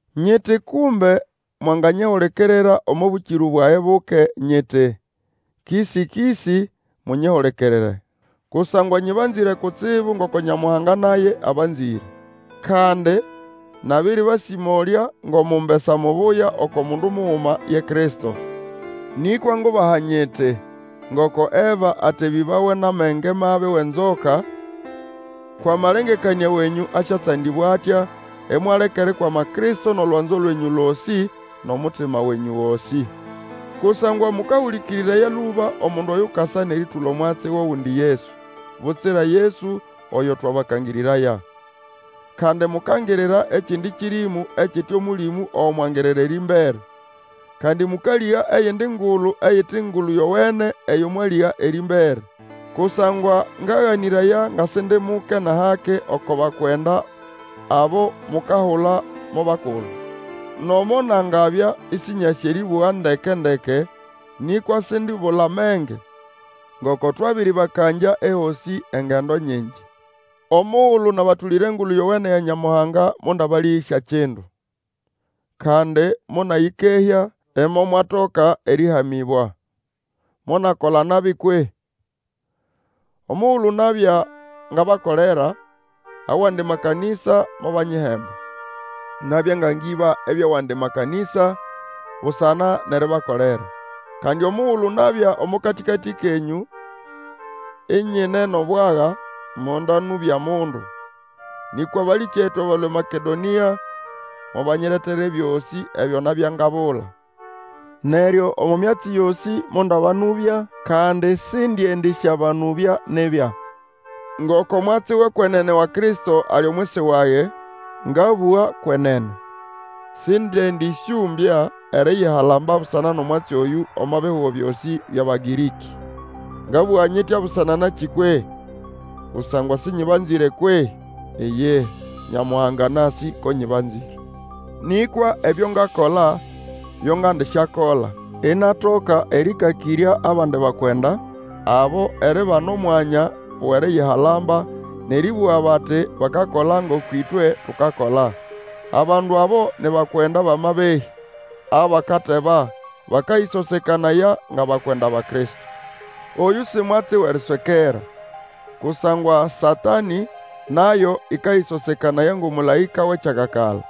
Nyiti kumbe mwanganyihulikirira omo bũkĩrũ bwage buke, nyiti, kĩsĩ-kĩsĩ munyihulikirire. Kusangwa nyĩbanzĩre kutsibu ngoko Nyamuhanga naye abanzĩre. Kandi nabĩrĩbasĩmolya ngʼomumbesa mubuya oko mundu muguma ye Kristo. Nĩkwa ngubaha nyiti, Ngoko Eva atebĩbawa nʼamenge mabi wʼenzoka, kwʼamalengekanĩa wenyũ asyatsandĩbwa atya, imwaleka erikwama Kristo nʼolwanzo lwenyũ losĩ, nʼomutima wenyũ gosĩ. Kusangwa mũkahũlĩkĩrĩraya lũba omundu oyukasa nʼerĩtũla omwatsi wʼogundi Yesu, butsira Yesu oyo twabakangĩrĩraya. Kandi mukangirira ekindi kĩrĩmũ ekite Omũlĩmũ ogo mwangirira erĩmbere, kandi mũkalĩga eyindi ngulu eyite Engulu Yowene eyo mwalĩga erĩmbere. Kusangwa ngaganĩraya nga Sindi muke nʼahake oko bakwenda abo mukahula mo bakulu. Nomo nangabya Ĩsĩnyasĩ erĩbũga ndeke-ndeke, nĩkwa sindibula menge; ngoko twabĩrĩbakangya ehosĩ engendo nyingi. Omugulu nabatũlĩra Engulu Yowene ya Nyamuhanga mondabalĩhĩsya kindu, kandi monayĩkehya, imomwatoka erĩhamĩbwa. Monakola nabi kwehĩ? Omugulu nabya ngabakolera, awandi makanĩsa mobanyihemba. Nabya nga ngĩba ebyʼawandi makanĩsa busana nʼeribakolera. Kandi omugulu nabya omo katĩkatĩ kenyũ inyine nʼobwaga, mondanũbya mundu; nĩkwa abalĩkyetu abalũa eMakedonĩa mobanyiretera ebyosĩ ebyo nabya ngabula. Neryo omo myatsi yosĩ mondabanũbya, kandi sindiendĩsyabanũbya nibya. Ngoko mwatsi wʼekwenene wa Kristo ali omwisi wage, ngabũga kwenene, sindiendĩsyũmbya eriyihalamba busana nʼomwatsi oyũ omo bihugo byosĩ byʼAbagĩrĩkĩ. Ngabũga nyitya busana nakĩ kwehĩ? Kusangwa sĩnyĩbanzĩre kwehĩ? Iyihi, Nyamuhanga anasĩ ko nyĩbanzĩre. Nĩkwa ebyo ngakola, byo ngandisyakola, inatoka erĩkakĩrya abandi bakwenda abo eribana omwanya wʼeriyihalamba, nʼerĩbũga bati, bakakola ngoko ĩtwe tukakola. Abandu abo ni bakwenda bʼamabehĩ abakateba, bakayĩsosekanaya ngʼabakwenda ba Kristo. Oyũ si mwatsi wʼeriswekera, kusangwa Satanĩ nayo ĩkayĩsosekanaya ngʼomũlaĩka wʼekyakakala.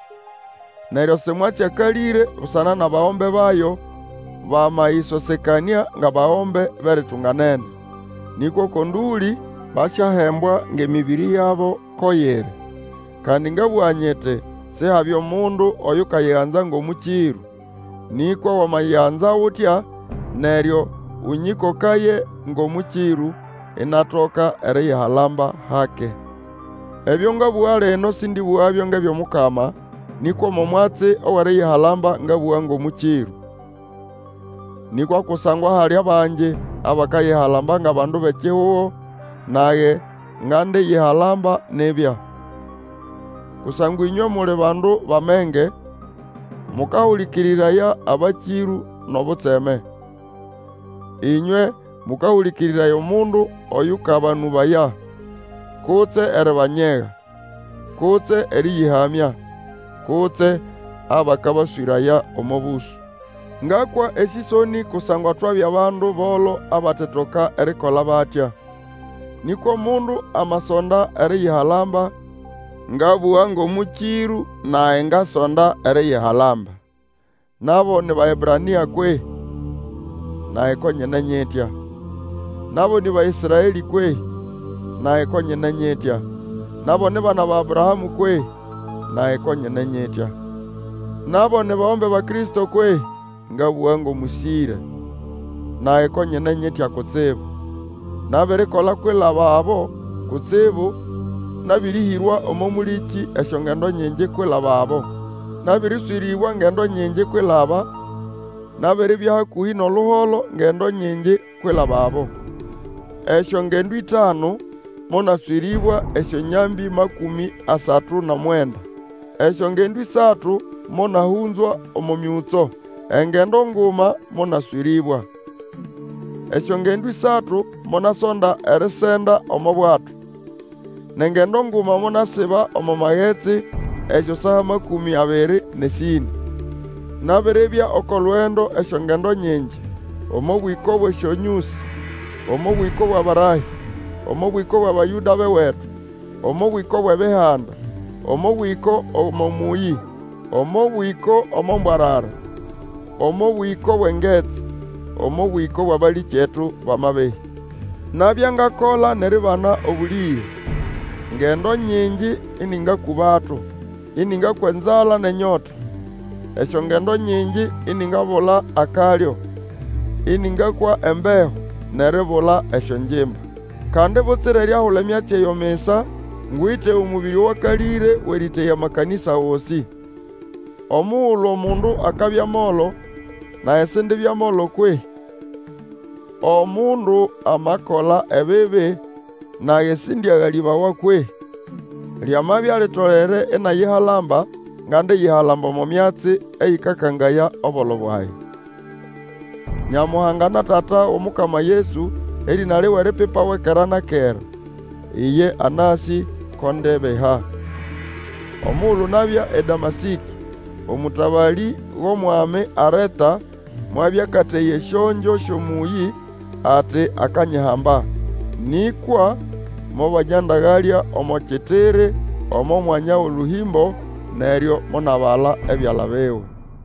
Neryo si mwatsi akalĩre busana nʼabagombe bayo, bamayĩsosekanĩa ngʼabagombe bʼeritunganene. Nĩkwa oko ndũlĩ basyahembwa ngʼemĩbĩrĩ yabo ko yiri. Kandi ngabũga nyiti, Sihabye mundu Oyukanyiganza ngʼomũkĩrũ. Nĩkwa wamanyiganza utya, neryo ũnyĩkokaye ngʼomũkĩrũ, inatoka eriyihalamba hake. Ebyo ngabũga lino sĩndĩbũgabyo ngʼebyʼOmukama, nĩkwa omo mwatsi wʼeriyihalamba ngabũga ngʼomũkĩrũ. Nĩkwa kusangwa hali bangi abakayihalamba ngʼabandu bʼekihugo, nage ngandiyihalamba nibya. Kusangwa ĩnywe muli bandu bʼamenge, mũkahũlĩkĩrĩraya abakĩrũ nʼobutseme. Ĩnywe mũkahũlĩkĩrĩraya omundu oyũkabanũbaya, kutse eribanyega, kutse erĩyĩhamya, kutse abakabaswĩraya omo bũsũ. Ngakwa esĩsonĩ kusangwa twabya bandu bolo abatetoka erikola batya. Nĩkwa omundu amasonda eriyihalamba, ngabũga ngʼomũkĩrũ, nage ngasonda eriyihalamba. Nabo ni Baebrania kwehĩ? Nage ko nyine nyitya. Nabo nĩ Baĩsraelĩ kwehĩ? Nage ko nyine nyitya. Nabo ni bana ba Abrahamũ kwehĩ? Nage ko nyine nyitya. Nabo ni bagombe ba Kristo kwehĩ? (ngabũga ngʼomũsĩre), Nage ko nyine nyitya kutsibu! Nabirikola kwilababo kutsibu, nabĩrĩhĩrwa omo mũlĩkĩ esyongendo nyingi kwilababo, nabĩrĩswĩrĩbwa ngendo nyingi kwilaba, nabiribya hakũhĩ nʼoluholo ngendo nyingi kwilababo. Esyongendo ĩtanu monaswĩrĩbwa esyonyambĩ makũmĩ asatu nʼomwenda. Esyongendo ĩsatu monahũnzwa omo myũtso, engendo nguma monaswĩrĩbwa. Esyongendo ĩsatu monasonda erisenda omo bwato, nʼengendo nguma monasiba omo magetsi esyosaa makũmĩ abiri nʼesĩnĩ. Nabiribya oko lugendo esyongendo nyingi, omo bwĩko bwʼesyonyũsĩ, omo bwĩko bwʼabarahĩ, omo bwĩko bʼAbayũda bʼewetu, omo bwĩko bwʼEbihanda, omo bwĩko omo mũyĩ, omo bwĩko omo mbwarara, omo bwĩko bwʼengetsi, omo bwĩko bwʼabalĩkyetu bʼamabehĩ. Nabya ngakola nʼeribana obũlĩge; ngendo nyingi ĩnĩngakũbato, ĩnĩngakwa enzala nʼenyota, esyongendo nyingi iningabula akalyo, ĩnĩngakwa embeho, nʼeribula esyongimba. Kandi butsira eriahula emyatsi eyo misa, ngwite omũbĩrĩ owakalĩre wʼerĩteya amakanĩsa gosĩ. Omugulu omundu akabya molo, nage sindibya molo kwehĩ? Omundu amakola ebibi, nage sindiagalĩbawa kwehĩ? Lyamabya litolere inayihalamba, ngandiyihalamba omo myatsi eyĩkakangaya obolo bwage. Nyamuhanga na Tata wʼOmukama Yesu, erĩna liwe lipipawe kera na kera, iye anasĩ ko ndebiha. Omugulu nabya eDamasĩkĩ, omũtabalĩ wʼOmwami Areta mwabya akateya esyongyo syʼomũyĩ, ati akanyihamba. Nĩkwa mobanyandagalya omo kitiri omo mwanya wʼolũhĩmbo, neryo monabala ebyala biwe.